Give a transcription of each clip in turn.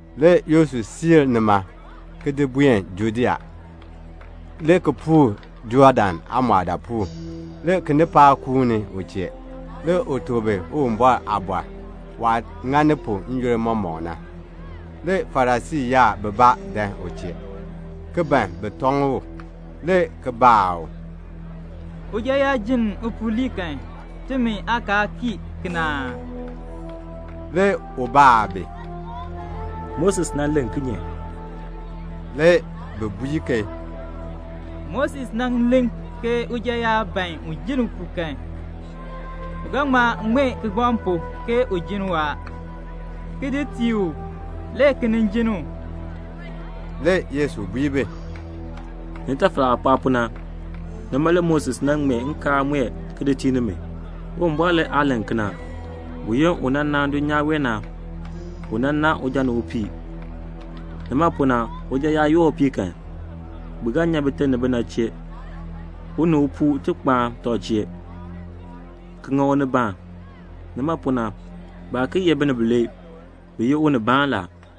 Le Yesu siir nima, le ki buen Judea, le ki puur Jɔɔdan aamɔɔdaapuul. Le kinipaak ki kuuni u chee. Le u tuk bi Uwumbɔr aaliin, waah ŋani pu n-yoonn mɔmɔk na. Le Farisii yaab bibaa dan u chee, le ki ban bi tɔŋ u, le ki baa u, "Uja yaa jenn upuu lii kan, timi aakaal kii kena aa?" Le u baa bi, "Moses nan len kinye?" Le bi bui ke, "Moses nan len ke uja yaa ban un jenn upuu kan, u ga ŋma ŋmee kigbaŋ pu ke u jenn u a, ki di tii u, le ki nin jenn u." Le Yesu bui bi, "Nitafal aah pɔɔ pu na, nima le Moses nan ŋmee nkaal mue ki di tii nimi. Uwumbɔr le aa len kena. Buyoonn u nan naan dulnyaa wee na, u nan naan uja ni upii. Nima pu na, uja yaa yoor upii kan, bi ga nyan bite ni bina chee, u ni upuu ti kpaan tɔb chee, ki ŋa unibaan. Nima pu na, baa ki ye binib bilee, bi ye unibaan la.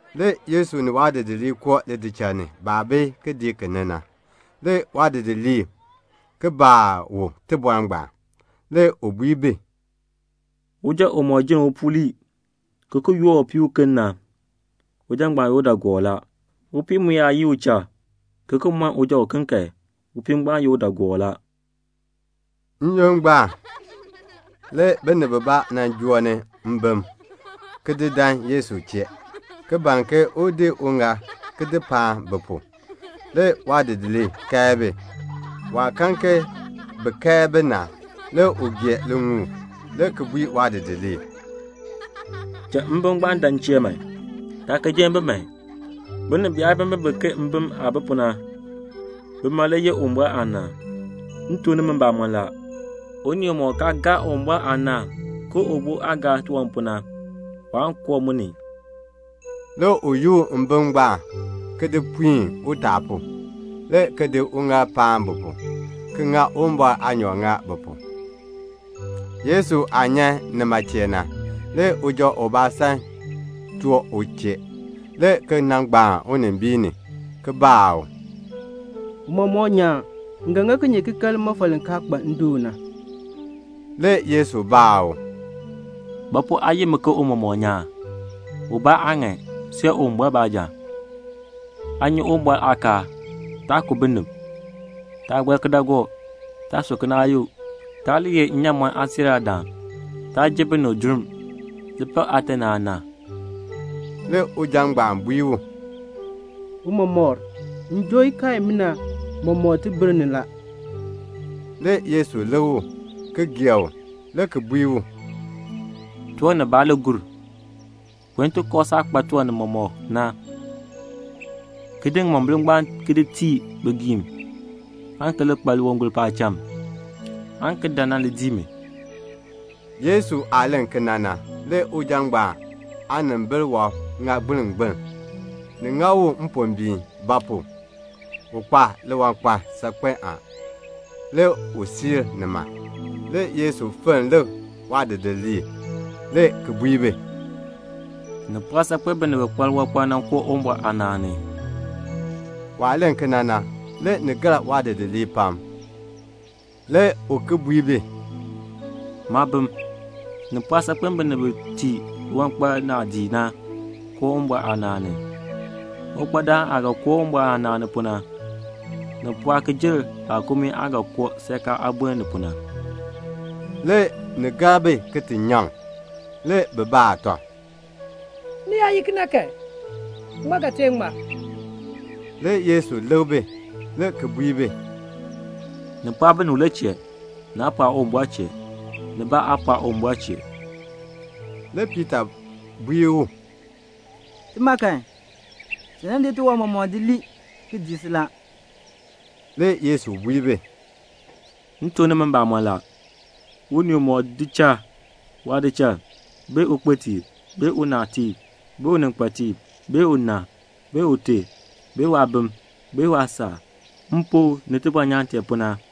Le Yesu ni waadidiliib koo lidichal ni. Baah bi kidiik ni na, le waadidiliib ki baa u tibɔr ngbaan. Le u bui bi, "Uja umɔk jenn upuu lii, ki ki yoor upii uken na, uja ngbaan ye udaagoor la. Upii mu yaa yii uchal, ki ki mɔn uja uken kan, upii ngbaan ye udaagoor la." N-yoonn ngbaan, le binib bibaa nan joo ni mbim, ki di dan Yesu chee, ki ban ke un di uŋaal ki di paan bi pu. Le waadidiliib kae bi. Waah kan ke bi kae bi na, le u gee liŋuul, le ki bui waadidiliib, "Cha mbim ngbaan dan m chee man. Taa ki jenn bi man. Binib biyaabimbin bi ke mbim aah bi pu na, bima le yeh Uwumbɔr aanaan. M tuk nimi mbamɔn la, unii umɔk kaa gaa Uwumbɔr aanaan ke ubo aah gaar tiwan pu na, waan koo mu ni." Le u yoor mbim ngbaan, ki di puin utaa pu, le ki di uŋaal paan bi pu, ki ŋa Uwumbɔr aanyoor ŋa bi pu. Le Yesu aah nyan nima chee na, le uja ubaa san choo u chee, le ki nan gbaan unimbiin ni, le ki baa u, "Tiicha nyaan, m ga ŋa kinye ki kan limɔfal li kaa kpa ndoon na?" Le Yesu baa u, "Ba pu aa yi mi ke tiicha nyaan? Ubaa aa ŋan, see Uwumbɔr baanja. Aa nyi Uwumbɔr aakaal la: 'Taa ku binib; taa gɔr kidaagook; taa su kinaayuk; taa li ye nnyaamɔn aasiiraadaan; taa ji binib durm; li pak aate ni aana."' Le uja ngbaan bui u, "Tiicha, m joo ikaal imina mɔmɔk tibir ni la." Le Yesu lik u, ki gee u, le ki bui u, "Tiwan nibaa le gur. Buen ti kooh saah kpa tiwan nimɔk na, ki di ŋimombil ngbaan ki di tii bigiim, aan ki li kpa liwangol paacham, aan ki dan nan dii mi." Yesu aah len kena na, le uja ngbaan aanimbil wɔb ŋa gbilngbiln. Ni ŋa u mpombiin; ba pu? u kpa liwankpal saakpen a. Le u siir nima. Le Yesu fenn lik waadidiliib, le ki bui bi, "Ni pɔɔ saakpen binib bi kpa liwankpal na koo Uwumbɔr aanaan ni." Waah len kena na, le ni gar waadidiliib pam. Le u ki bui bi, "Maabim, ni pɔɔ saakpen binib bi tii liwankpal naadii na koo Uwumbɔr aanaan ni. Uwankpadaan aah ga koo Uwumbɔr aanaan ni pu na, ni pɔɔ ki jer laakumii aah ga koo seerkaa aameer ni pu na." Le ni gar bi ki ti nyaŋ. Le bi baa tɔb, "Ni yaa ye kena kan, ŋmaa ga tee ŋmar?" Le Yesu lik bi, le ki bui bi, "Ni pɔɔ binib le chee. Naa pɔɔ Uwumbɔr chee; nibaa aa pɔɔ Uwumbɔr chee." Le Piita bui u, "Tima kan, ti nan di tiwan mɔmɔk di lii, ki dii si la." Le Yesu bui bi, "M tuk nimi mbamɔn la, unii umɔk di cha waadichal, bee ukpitiib, bee unaatiib, bee uninkpatiib, bee una, bee ute, bee waabim, bee waasaak, m pu ni tibɔnyaan tee pu na,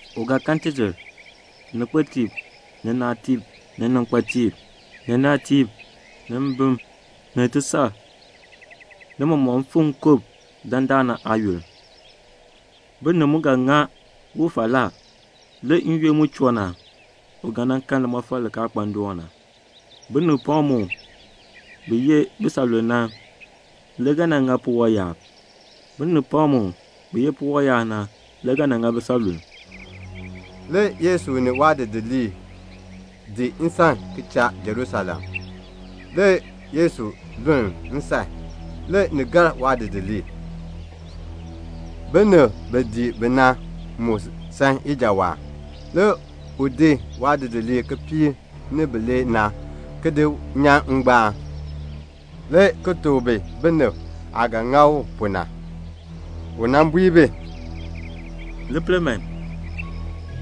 u ga kan tidir, ni kpetiib, ni naatiib, ni ninkpateeb, ni natiib, ni mbim, ni tisar, ni mɔmɔk mfim nkub dandana aayoonn. Binib mu ga ŋa u falaa. N-yoonn mu choo na, u ga kan limɔfal li kaa kpa ndoon na. Binib pam mu, bi ye bisanlulm na, le ga nan ŋa puwɔb yaab. Binib pam mu, bi ye puwɔb yaab na, le ga nan ŋa bisanlulm." Le Yesu ni waadidiliib dii nsan ki cha Jerusalem. Le Yesu luln nsan. Le ni gar waadidiliib. Binib bi dii bi na mu san ijawaan. Le u di waadidiliib kipiik ni bilee na, ki di nyan ngbaan, le ki tuk bi binib aah ga ŋa u pu na. U bui bi, "Li pel man,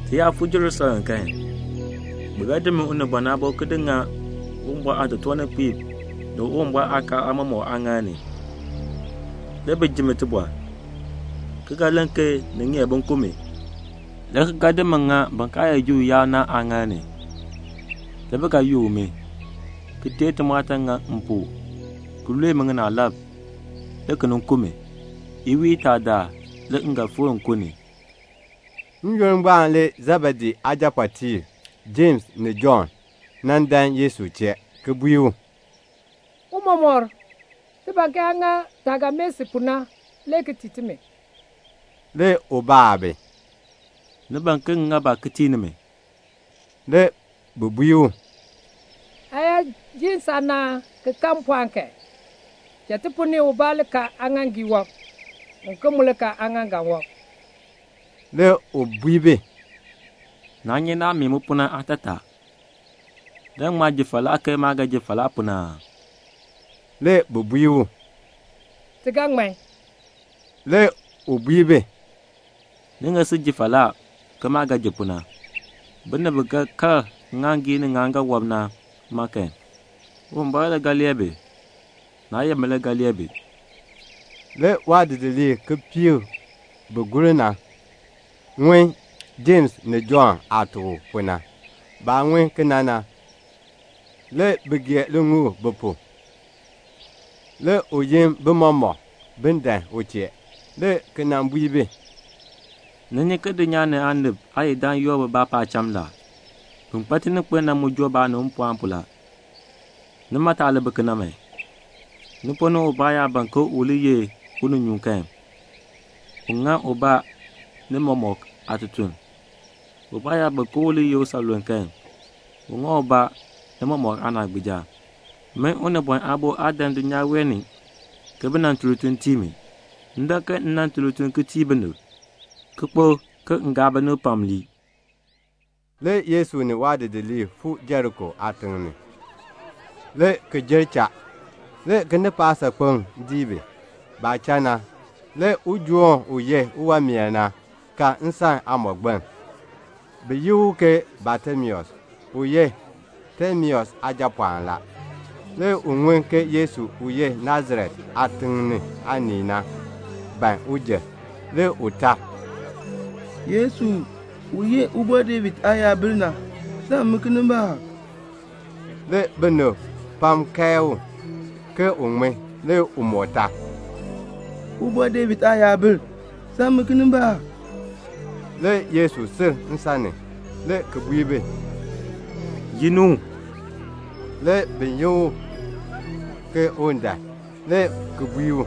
ti yaa fuu Jerusalem kan, bi ga di min Unibɔn Aabo ki di ŋa Uwumbɔr aatotoorninkpiib ni Uwumbɔr aakaal aamɔmɔkb aaŋaal ni, le bi ji mi tibɔr, le ki ga len ke ni ŋeer bin ku mi, le ki ga di mi ki di ŋa bin kaa ye Juu yaab na aaŋaal ni. Le bi ga yook mi, ki teei timɔɔtan ki ŋani m pu, ki lue mi ŋinaalab, le ki nin ku mi. Iwiin itaa daal le m ga fikr nkun ni." N-yoonn ngbaan le Sebedee aajapɔɔtiib Jems ni Jɔnn nan dan Yesu chee, le ki bui u, "Tiicha, ti ban ke aa ŋa taah ga mee si pu na le ki tii timi." Le u baa bi, "Ni ban ke m ŋa ba le ki tii nimi?" Le bi bui u, "Aa yaa ji saanaan ki kan mpɔɔn kan, cha ti ponn ni ubaa li kal aaŋaaŋgii wɔb, uken mu li kal aaŋaaŋgan wɔb." Le u bui bi, "Naa nyi naah mee mi pu na aatataa. Ni ga ŋma ji falaa ke maah ga ji falaa pu na aa?" Le bi bui u, "Ti ga ŋman." Le u bui bi, "Ni ga sil ji falaa, ke maah ga ji pu na. Binib bi ga kal ŋŋaaŋgii ni ŋŋaaŋgan wɔb na ma kan, Uwumbɔr le lee bi; naa ye min le ga lee bi." Le waadidiliib kipiik bi gur na ŋun Jems ni Jɔnn aah tuk u pu na. Baah ŋun kena na, le bi gee liŋuul bi pu. Le u yin bi mɔmɔk, bin dan u chee, le ki bui bi, "Ni nyi ke dulnyaa ni aanib aayidam yoor bibaa paacham la. Bin kpa tininkpil na mu joo baanib mpɔɔn pu la. Nimi, ni taa li bi kena man. Ni ponn ni ubaa yaa ban ke u li ye uninyuun kan, un ŋa ubaa ni mɔmɔk aatutuln. Ubaa yaa ban ke u li ye usanluln kan, un ŋa ubaa ni mɔmɔk aanaagbiija. Min Unibɔn Aabo, maa dan dulnyaa wee ni ke bi nan tun lituln tii mi. M dan ke m nan tun lituln ki tii binib, ki kpo ke m gaa binib pam ki lii." Le Yesu ni waadidiliib fuu Jeriko aatiŋ ni, le ki jer. Le kinipaak saakpeŋ dii bi. Baah cha na, le ujoon u ye uwanmeer na, ka nsan aamɔgbiln, bi yi u ke Batimeus, u ye Timeus aajapɔɔn. Le u ŋun ke Yesu u ye Nasaret aatiŋ aanii na, ban un jer. Le u tar, "Yesu, u ye Ubɔr David aayabil na, sam mi kinimbaak." Le kinipaak kae u, ke un ŋmin. Le u moo tar, "Ubɔr David aayabil, sam mi kinimbaak." Le Yesu sil nsan ni, le ki bui bi, "Yi ni u." Le bi yin u ke un dan, le ki bui u,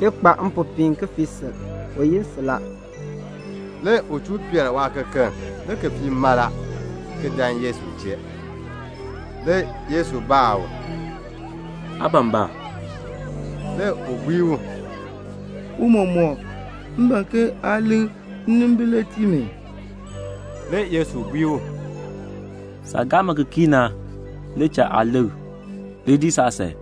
"Li kpa mpopiin, ki fii sil. U yi si la." Le u chuu nyan waakekeln, le ki fii mala, ki dan Yesu chee. Le Yesu baa u, "Aa ban ba?" Le u bui u, "Tiicha, m ban ke aa likr nnimbil le tii mi." Le Yesu bui u, "Saah gaa mi ki kii na le cha aa likr. Li dii saasan."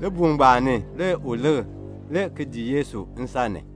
Libuul ngbaan ni le u likr, le ki dii Yesu nsan ni.